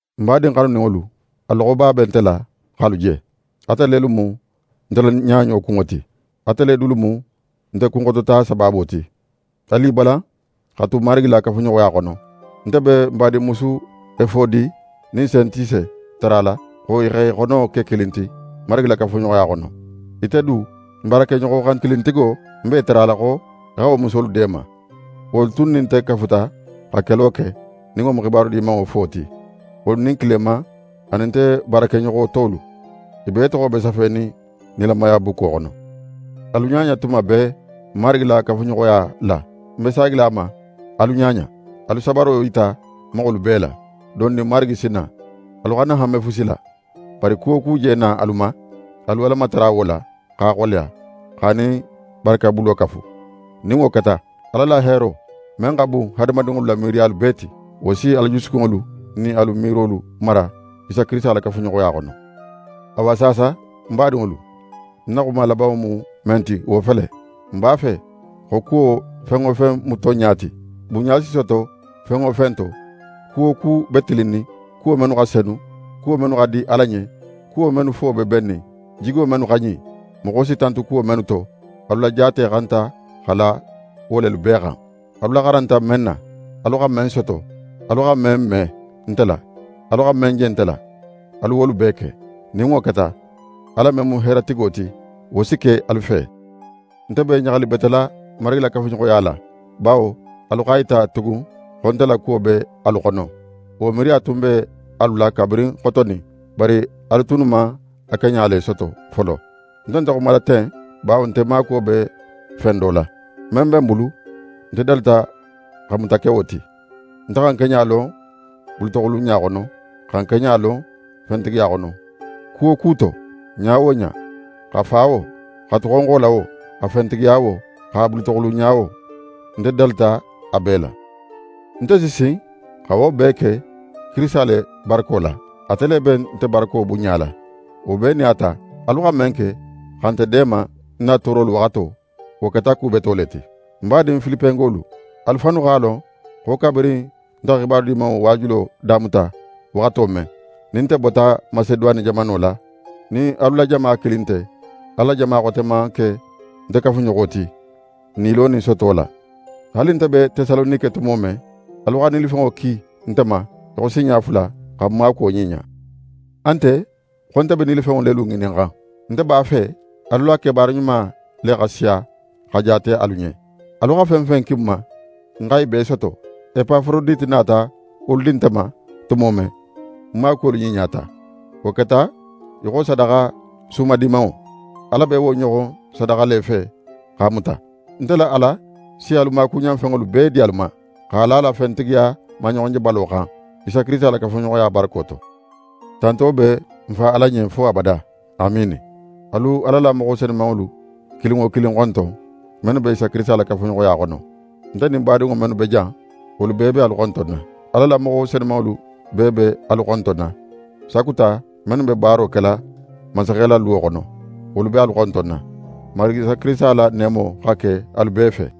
Nte badin xanuninŋolu, a loxoba be nte la x'alu je. Ate lelu mu nte la ɲaɲo kunŋo ti. Ate le dulu mu nte kunxotota sabaabo ti. Alu i balan xa tu Marigi la kafuɲoxoya xono. Nte be n badinmusu Efodi nin Sentise tarala, xo i x'e xono ke kilin ti Marigi la kafuɲoxoya xono. Ite du, ń baarakeɲoxo xankilintigo, ń b'é tarala xo í xa wo musolu deema. Wolu tunnu nin nte kafuta xa kelo ke, nin wo mu xibaru Dimanŋo fo ti, wolu nin Kileman anin nte baarakeɲoxo tolu. I bee toxo be safenin nilamaya bukko xono. Alu ɲaɲa tuma bee Marigi la kafuɲoxoya la. Ń be saagila a ma, alu ɲaɲa. Alu sabaro yita moxolu bee la. Dondin Marigi si na. Alu xana hanme fusi la, bari ku wo ku je na alu ma, alu Ala matara wo la, x'a xoleya, x'a nin barakebulo kafu. Nin wo keta, Ala la heero men xa bun hadamadinŋolu la miiriyalu bee ti, wo si alu jusukunŋolu nin alu miirolu mara Isa Kirisita la kafuɲoxoya xono. Awa saasa, ń badinŋolu, ń na xuma labanŋo mu men ti wo fele: Nte b'a fe xo kuwo fen wo fen mu tonɲa ti, bunɲa si soto fen wo fen to, ku wo ku be tilinnin, kuwo mennu xa senu, kuwo mennu xa di Ala ɲen, kuwo mennu fo be bennin, jigo mennu xa ɲin, moxo si tantu kuwo mennu to, alu la jaate xanta xa la wo lelu bee xan. Alu laxaranta men na, alu xa men soto, alu xa men me nte la, alu xa men je nte la, alu wolu bee ke. Nin wo keta, Ala men mu heero tigo ti, wo si ke alu fe. Nte be ɲaxalibetela Marigi la kafuɲoxoya la, bawo alu x'a yita tugun xo nte la kuwo be alu xono. Wo miiriya tun be alu la kabirin xotonin, bari alu tunnu man a keɲa le soto folo. Nte nte xumala ten bawo nte maakuwo be fen do la. Men be ń bulu, nte dalita xa muta ke wo ti. Nte xa ń keɲa lon bulutoxulunɲa xono, xa ń keɲa lon fentigiya xono. Ku wo ku to, ɲa wo ɲa, xa fa wo, xa tu xonxo la wo, xa fentigiya wo, xa bulutoxulunɲa wo, nte dalita a bee la. Nte si sin xa wo bee ke Kirisita le barako la; ate le be nte barako bunɲala. Wo bee nin a ta, alu xa men ke, xa nte deema ń na toorolu waxato, wo keta ku beto le ti. Ń badin Filipengolu, alu fannu x'a lon xo kabirin nte xa xibaru Dimanŋo waajulo damuta waxato men, nin nte bota Maseduwane jamano la, nin alu la jama kilin nte, Ala la jama xote man ke nte kafuɲoxo ti, nilo nin soto la. Haali nte be Tesalonike tumo men, alu xa nilifenŋo ki nte ma í xo sinɲa fula, xa ń maakuwo ɲiɲa. A nte xo nte be nilifenŋo lelu ŋininxan. Nte b'a fe alu la kebaara ɲuma le xa siya, xa jaate alu ɲen. Alu xa fen fen ki ń ma, ń xa i bee soto. Epaforodite nata wolu di nte ma tumo men, ń maakuwolu ɲiɲata. Wo keta í xo sadaxa sumadimanŋo; Ala be wo ɲoxon sadaxa le fe, x'a muta. Nte la Ala si alu maakuɲanfenŋolu bee di alu ma, x'a la a la fentigiyaba maɲoxonjebalo xan, Isa Kirisita la kafuɲoxoya barako to. Tanto be n Fa Ala ɲen fo abada. Amiini! Alu Ala la moxo senumanŋolu kilin wo kilin xonton, mennu be Isa Kirisita la kafuɲoxoya xono. Nte nin badinŋo mennu be jan, wolu bee be alu xontonna. Ala la moxo senumanŋolu bee be alu xontonna; sakuta mennu be baaro kela mansaxe la luwo xono, wolu be alu xontonna. Marigi Isa Kirisita la neemo xa ke alu bee fe.